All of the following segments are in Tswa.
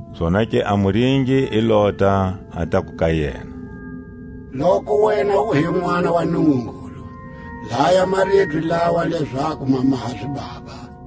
Zonake a muringi i lota, a taku ka yena: Loku wena u hi Nʼwana wa Nungungulu, laya a maribye lawa lezaku ma maha zibaba.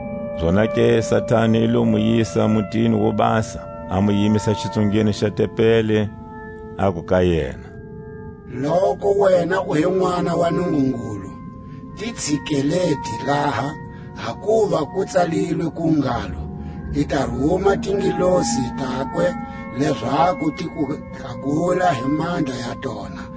Zonake Satani i lo mu yisa mutini wo basa, a mu yimisa xixungweni xa tempeli, aku ka yena: Loku wena u hi Nʼwana wa Nungungulu, ti tsikelete laha, hakuva ku tsalilwe ku ngalo: I ta ruma tingelosi takwe Lezaku ti ku tlakula hi mandla ya tona,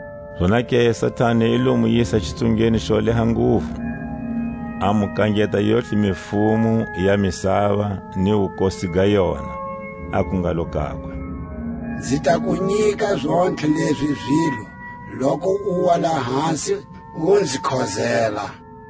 Zonake Satani i lo mu yisa xitsungeni xo leha nguvu, a mu kangeta yontlhe mifumo ya misava ni wukosi ga yona; aku ngalo kakwe: Nzi ta ku nyika zontlhe lezi zilo, loku uwa lahasi u nzi khozela.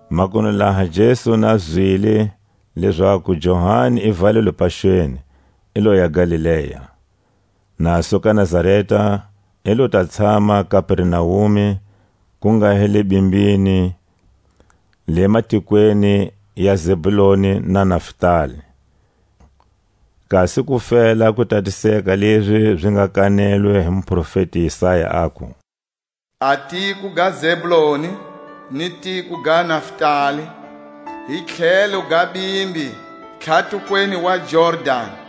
Makunu laha Jesu na Zwile lezaku Johani i valelwe paxweni, i loya Galilea. Na suka Nazareta, i lo ta tshama Kapernaume, ku nga hi le bimbini, le matikweni ya Zebuloni na Naftali; kasi ku fela ku tatiseka lezi zi nga kanelwe hi muprofeti Isaya, aku: A tiko ga Zebuloni ni tiko ga Naftali, Hi tlhelo ga bimbi, tlhatukweni wa Jordani,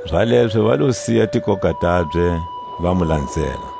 Zalezo va lo siya tikoka tabye, va mu lanzela.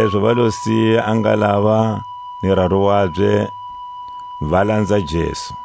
Zalezo va lo siya a ngalava ni raru wabye, va lanza Jesu.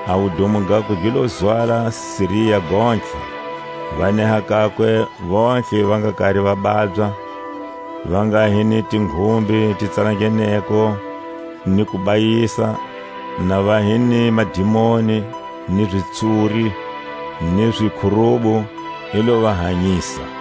A wudumo gakwe gi lo zwala Siria gontlhe. Va neha kakwe vontlhe va nga kari va babya, va nga hi ni tinghumbe ti tsalangeneko ni kubayisa, na va hi ni madimoni, ni zitsuri, ni zikhurubu, i lo va hanyisa.